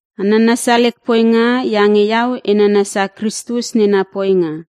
A nanasia lek poinga iange iau e nanasia Kristus nena poinga.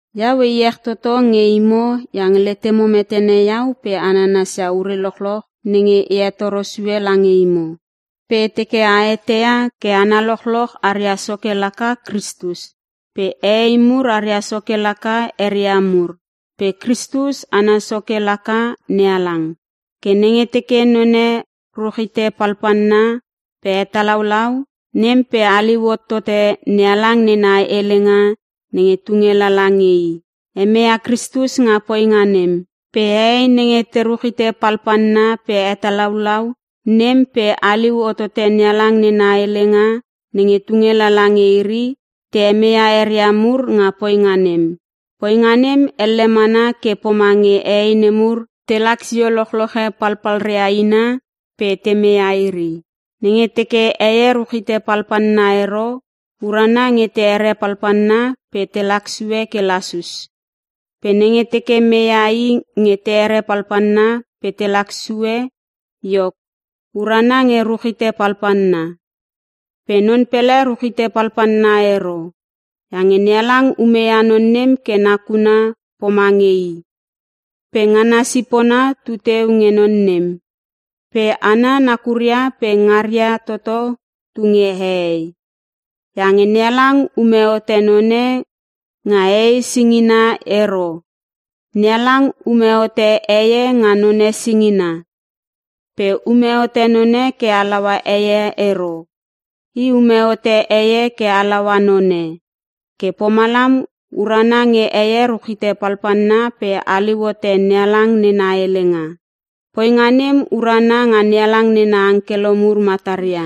Iau e iech toto nge imo iange letemo metene iau pe a nanasia ure lochloch nenge e hetoro sue lange imo. Pe e teke a eteia ke hana lochloch aria soke laka Kristus pe hehei mur aria soke laka eria mur pe Kristus ana soke laka NeHalang. Ke nenge teke none ruchite palpalna pe hetalaulau nem pe haliu hotote NeHalang nena helenga nenge tunge lala nge i, hemeia Kristus nga poinga nem. Pe hehei nenge te ruchite palpalna pe hetalaulau, nem pe haliu hotote NeHalang nena helenga nenge tunge lala nge iri, te hemeia eria mur nga poinga nem. Poinga nem elle mana ke pomange hehei nemur nenge telak sio lochloche palpalria ina pe te meia iri. Nenge teke heie ruchite palpalna ero, urana nge te here palpalna pe te laksue ke lasus. Pe nenge teke meia i nge te here palpalna pe te laksue iok, urana nge ruchite palpalna. Pe non pele ruchite palpalna ero. Iange NeHalang umeia non nem ke nakuna pomange I pe ngana sipona tu teu nge non nem. Pe hana nakuria pe ngaria toto tu nge hehei. Iange NeHalang ume hote none nga hehei singina ero. NeHalang ume hote heie nga none singina. Pe ume hote none ke halaua heie ero. I ume hote heie ke halaua none. Ke pomalam urana nge heie ruchite palpalna pe haliu hote NeHalang nena helenga, poinga nem urana nga NeHalang nena angkelo mur mataria.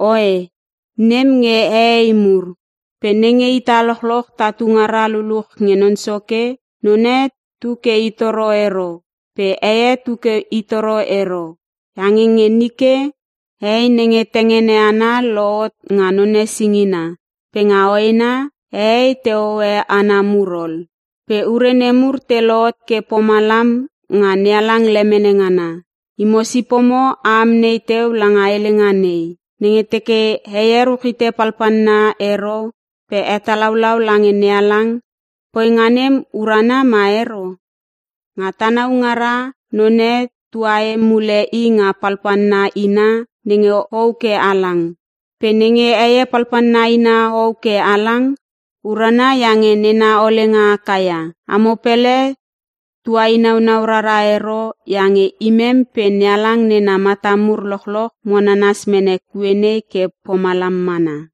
Oe, nem nge hehei mur. Pe nenge ita lochloch tatu ngara luluch nge Non Soke, none tu ke i toro ero pe heie tu ke i toro ero. Iange nge nike, hei nenge tengene ana lohot nga none singina, pe nga hoena hehei te hohoe hana mur ol. Pe ure nemur te lohot ke pomalam nga NeHalang lemene ngana. Imo sipomo a amnei teu langa helenga nei: Nenge teke heie ruchite palpalna ero pe hetalaulau lange NeHalang, poinga nem urana ma ero? Nga tanau ngara, none tuahe mule i nga palpalna ina nenge hou ke halang. Pe nenge heie palpalna ina hou ke halang, urana iange nena olenga haka ia. Amo pele tuinaunau rara ero iange imem pe NeHalang nena mata mur lochloch mo nanas mene kue nei ke pomalam mana.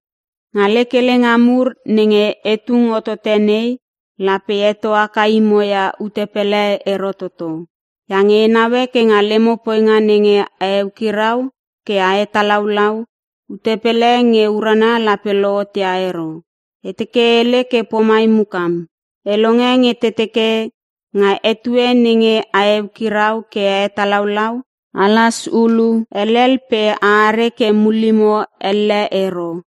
Nga lek helenga mur nenge e tung hotote nei, lape e heto haka imo ia ute pele ero toto. Iange e naue ke nga lemo poinga nenge a eukirau ke a hetalaulau, ute pele nge urana lape lohot ia ero. E teke e hele ke pomai mukam. E longe nge te teke nga etue nenge a hekirau ke a hetalaulau, alas hulu helel pe a are ke mullimo elle ero,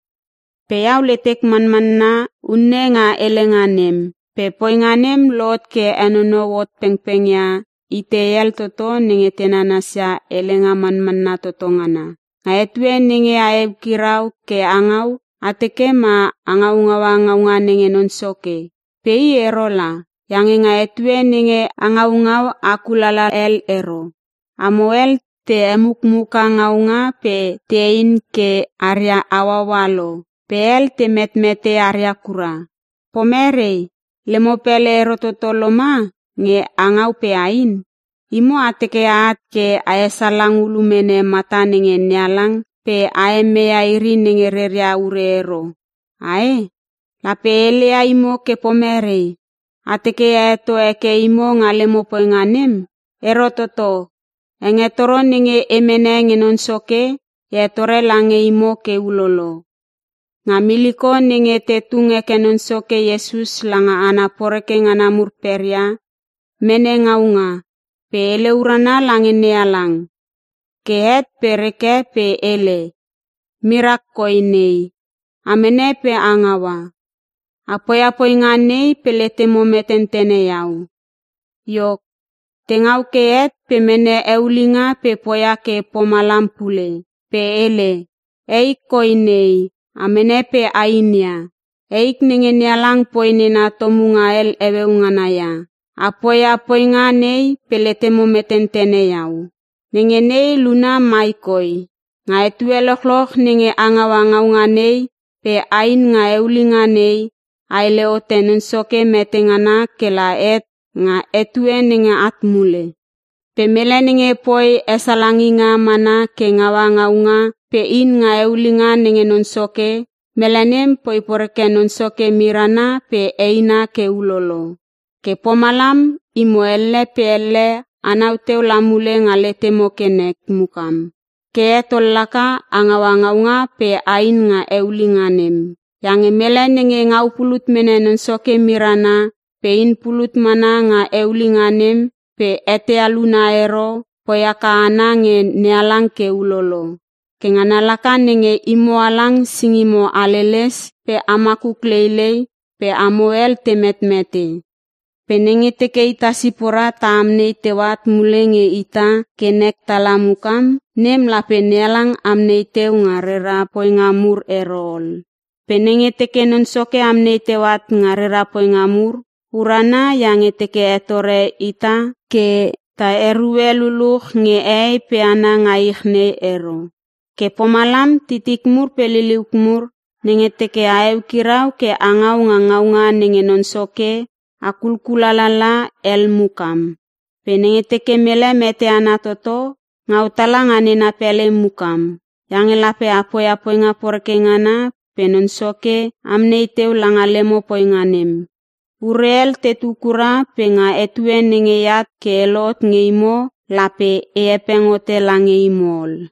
pe iau letek manmanna unne nga helenga nem. Pe poinga nem lohot ke henonou hot pengpeng ia itei hel toto nenge te nanasia helenga manmanna toto ngana. Nga etue nenge a eukirau ke a ngau, a teke ma a ngaungaua ngaunga nenge Non Soke, pe i ero la. Iange nga etue nenge a ngaungau a kulala hel ero. Amo hel te hemukmuka ngaunga pe tein ke aria hauaua lo pe hel te metmete aria kura. Pomerei? Lemo pele ero toto loma nge a ngau pe ain? Imo a teke a at ke a hesalang ulu mene mata nenge NeHalang pe a hemeia iri nenge reria ure ero, ae? Lape e heleia imo ke pomerei? A teke e heto heke imo nga lemo poinga nem? Ero toto. Hengetoro nenge e mene nge Non Soke, e hetore lange imo ke ulolo: Nga miliko nenge te tung heke Non Soke Iesus langa hana poreke ngana mur peria, mene ngaunga pe hele urana lange NeHalang. Ke het pe reke pe hele, “Mirak koi nei. A mene pe a ngaua. A poia poinga nei pe letemo metentene iau.” Iok, te ngau ke het pe mene eulinga pe poia ke pomalam pule, pe hele, “Eik koi nei a mene pe ain ia. Eik nenge NeHalang poi nena tomunga hel heueu ngana ia. A poia poinga nei pe letemo metentene iau.” Nenge nei luna mai koi, nga etue lochloch nenge a ngaua ngaunga nei pe ain nga eulinga nei, a hele hote Non Soke mete ngana kela het nga etue nenge at mule. Pe mele nenge poi esalanginga mana ke ngaua ngaunga pe in nga eulinga nenge Non Soke, mele nem poi poreke Non Soke mirana pe eina ke ulolo. Ke pomalam imo elle pe elle anau teu la mule nga letemo ke nek mukam. Ke het ol laka a ngaua ngaunga pe ain nga eulinga nem. Iange mele nenge ngau pulut mene Non Soke mirana pe in pulut mana nga eulinga nem pe eteia luna ero, poi haka ana nge NeHalang ke ulolo. Ke ngana laka nenge imo halang singimo haleles pe a makuk leilei pe amo hel te metmete. Pe nenge teke ita sipora ta amnei teu at mule nge ita ke nek tala mukam, nem lape NeHalang amnei teu nga rera poinga mur ero ol. Pe nenge teke Non Soke amnei teu at nga rera poinga mur, urana iange i teke hetore ita ke ta erue luluch nge hehei pe hana nga ich nei ero. Ke pomalam titik mur pe liliuk mur, nenge teke a eukirau ke a ngau nga ngaunga nenge Non Soke, a kulkulala hel mukam. Pe nenge teke mele mete ana toto, ngau tala nga nena pele mukam. Iange lape a poia poinga poreke ngana pe Non Soke amnei teu langa lemo poinga nem. Ure hel tetu kura pe nga etue nenge eat ke e lohot nge imo, lape e hepeng hote lange imo ol.